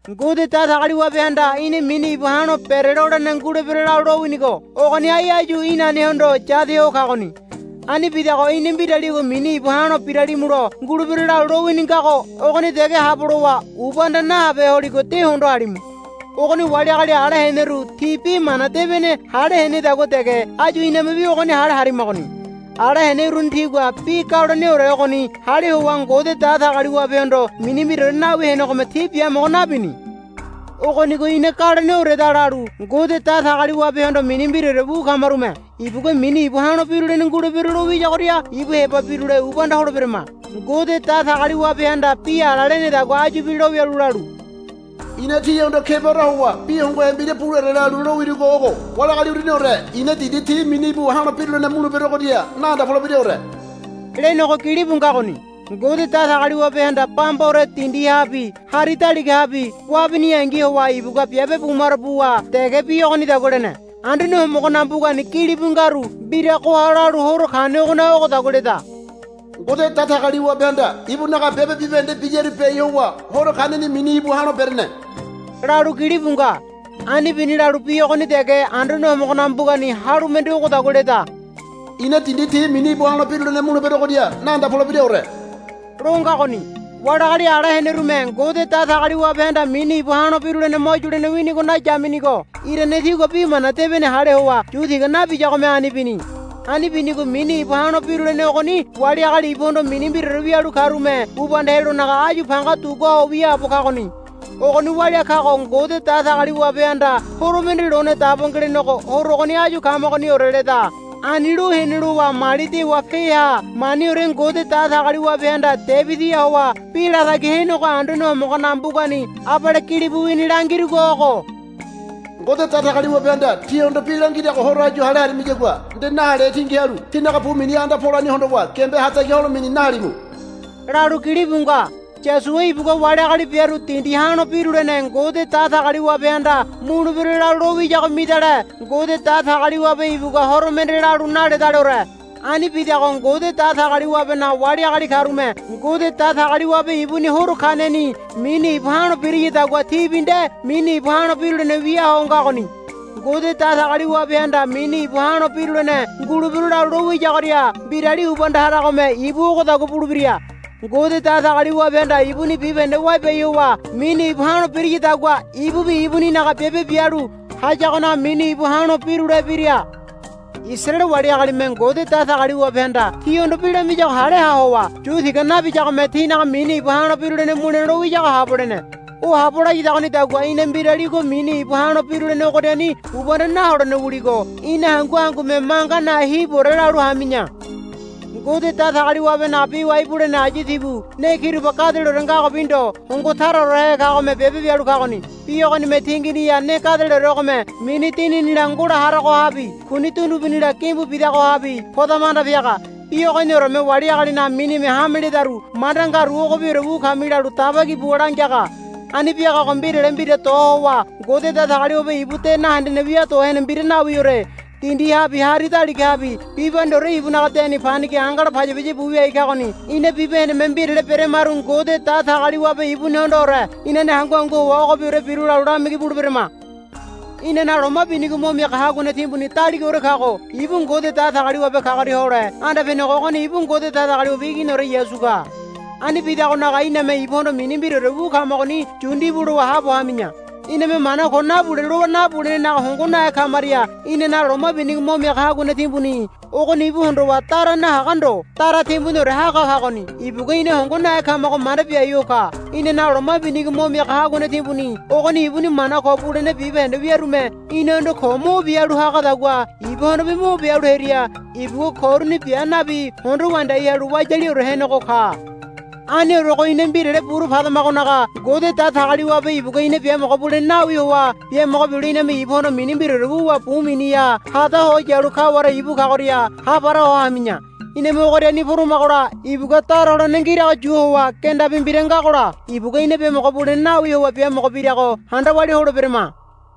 Ngode Datagaliwabehanda ina mini íbu ha̱lo berelolene ngulebero lalu lowinigo ogoni ai áyu inanehondo yade ho kagoni. Ani bidago ina mbiraligo mini íbu ha̱lo biralimulo ngulebero lalu lowini ngago ogoni dege habo lowa ubanda nahabehe holigo de hondo halimu. Ogoni wali agali ala heneru ti Bi Mana Debene hale henedagua dege áyu inamebi ogoni hale harimagoni. Ala hene uruni tigua bi galoneore ogoni hale howa Ngode Datagaliwabehondo mini mbiraore nawi henegome ti biamogo nabini. Ogonigo ina galoneoreda lalu Ngode Datagaliwabehondo mini mbiraore wu kamarume ibugua mini íbu ha̱lo birulene ngulebero lo wiyagoria ibu heba birule ubanda holeberama. Ngode Datagaliwabehanda bi ala lenedagua áyubi lowialu lalu, I̱na tihondo kebaore howa bi hongohe mbira buleore lalu lowirugo ogo, Wali agali uruniore i̱na dindi ti mini íbu ha̱lo birulene muleberogoria naanda polebiraore, lenego gilibu ngagoni. Ngode Datagaliwabehanda bambaore dindihabi hari daligahabi wabiniyangi howa ibugua biabe bumaro buwa dege bi ogonidagua lene. Anduane Homogonaga mbugani gilibu ngaru mbiragoha lalu horo kanegonaga ogodagua leda, Ngode Datagaliwabehanda ibunaga biabe bibahende biyaru biai howa horo kaneni mini íbu ha̱lo berene, lalu gilibu nga. Ani bini lalu bi ogoni dege Anduane Homogonaga mbugani halu mende ogodagua leda. I̱na dindi ti mini íbu ha̱lo birulene muleberogoria naanda polebiraore, lo ngagoni. Wali agali ala henerume Ngode Datagaliwabehanda mini íbu ha̱lo birulene mo yulene winigo nayaminigo irane tigua Bi Mana Debene hale howa yu tiga nabiyagome ani bini. Ani binigo mini íbu ha̱lo birulene ogoni wali agali ibuhondo mini mbiraore wialu karume ubanda helonaga áyu panga dugua ho wiaabo kagoni. Ogoni walia kago Ngode Datagaliwabehanda horo mende lone dabo ngelenego horo ogoni áyu kamagoniore leda. Ani lo hene lowa mali dewa peaha maniore Ngode Datagaliwabehanda Debidiha howa bi latagi henego Anduane Homogonaga mbugani abale gilibu wini langirugo ogo, Ngode Datagaliwabehanda tíhondo bi langirago horo áyu hale harimiyagua nde nahalehe tingi halu tínaga bu miniha anda polani hondowa giambe hatagi holamini nahalimu, lalu gilibu nga. Yosua ibugua wali agali biaru dindi ha̱lo birulene Ngode Datagaliwabehanda mulebero lalu lo wiyago midale Ngode Datagaliwabe ibugua horo mende lalu naledaleore. Ani bidago Ngode Datagaliwabenaga wali agali karume Ngode Datagaliwabe ibuni horo kaneni mini íbu ha̱lo birayadagua tibi nde mini íbu ha̱lo birulene wia ho ngagoni. Ngode Datagaliwabehanda mini íbu ha̱lo birulene ngulebero lalu lo wiyagoria mbirali ubanda haragome ibu ogodagua bulebira. Ngode Datagaliwabehanda ibuni bibahende wabiai howa mini íbu ha̱lo birayadagua ibubi ibuninaga biabe bialu hayagonaga mini íbu ha̱lo birulebira. Isaraele wali agalime Ngode Datagaliwabehanda tihondo bi lamiyago hale ha howa yu tiga nabiyagome tinaga mini íbu ha̱lo birulene mule lo wiyago habo lene. O habo layadagonidagua ina mbiraligo mini íbu ha̱lo birulene ogoriani ubanda naholene wuligo ina hangu hangume manga nahe hibuore lalu hami̱ya. Ngode Datagaliwabenaga bi wai bulene ayu tibu ne kiroba gadeleore ngagobi ndo hongo taraorehe kagome biabe bialu kagoni. Bi ogonime tinginiha ne gadeleoregome mini dininila ngola haragohabi kuni dundugunila gimbu bidagohabi podama anda piaga. Bi ogonioreme wali agalinaga minime hame ledaru manda ngaru ogobiore wu kami lalu daba ki buwa langiaga. Ani biagago mbirale mbira do howa Ngode Datagaliwabe ibu de nahendene wia do hene mbira nawiore. Dindihabi hari daligahabi bibahendeore ibunaga deni panigi angala paya paya bu wiai kagoni. Ina bibahendeme mbirale beramaru Ngode Datagaliwabe ibunihondoore inane hangu hangu howa ogobiore biru lalu lamigi buleberama. Inanaga loma binigo mo miaga haguane timbuni daligaore kago ibu Ngode Datagaliwabe kagoria hole anda penego ogoni ibu Ngode Datagaliwabe Iginiore Yasu ka. Ani bidagonaga iname ibuhondo mini mbiraore wu kamagoni yu ndibu lowa haabo hami̱ya. Iname mana ko nabule lowa nabulenenaga hongo nahe kamaria inanaga loma binigo mo miaga haguane timbuni ogoni ibu hondowa dara nahaga ndo dara timbuniore haga kagoni. Ibugua ina hongo nahe kamago manda biai ho ka. Inanaga loma binigo mo miaga haguane timbuni ogoni ibuni mana ko bulene bibahende wiarume inahondo ko mo bia halu hagadagua ibuhondobi mo bia halu hearia ibugua ko uruni bia nabi hondo wandiai halu wayaliore henego ka. Aniorego ina mbirale buru padamagonaga Ngode Datagaliwabe ibugua ina biamogo bulene nawi howa biamogo bilo iname ibuhondo mini mbiraore wuwa bu miniha hada ho yalu kaware ibu kagoria hapara ho hami̱ya. Iname ogoriani poramagola ibugua dara holene ngirago yu howa gendabi mbira ngagola ibugua biamogo bulene nawi howa biamogo birago handa walia holeberama.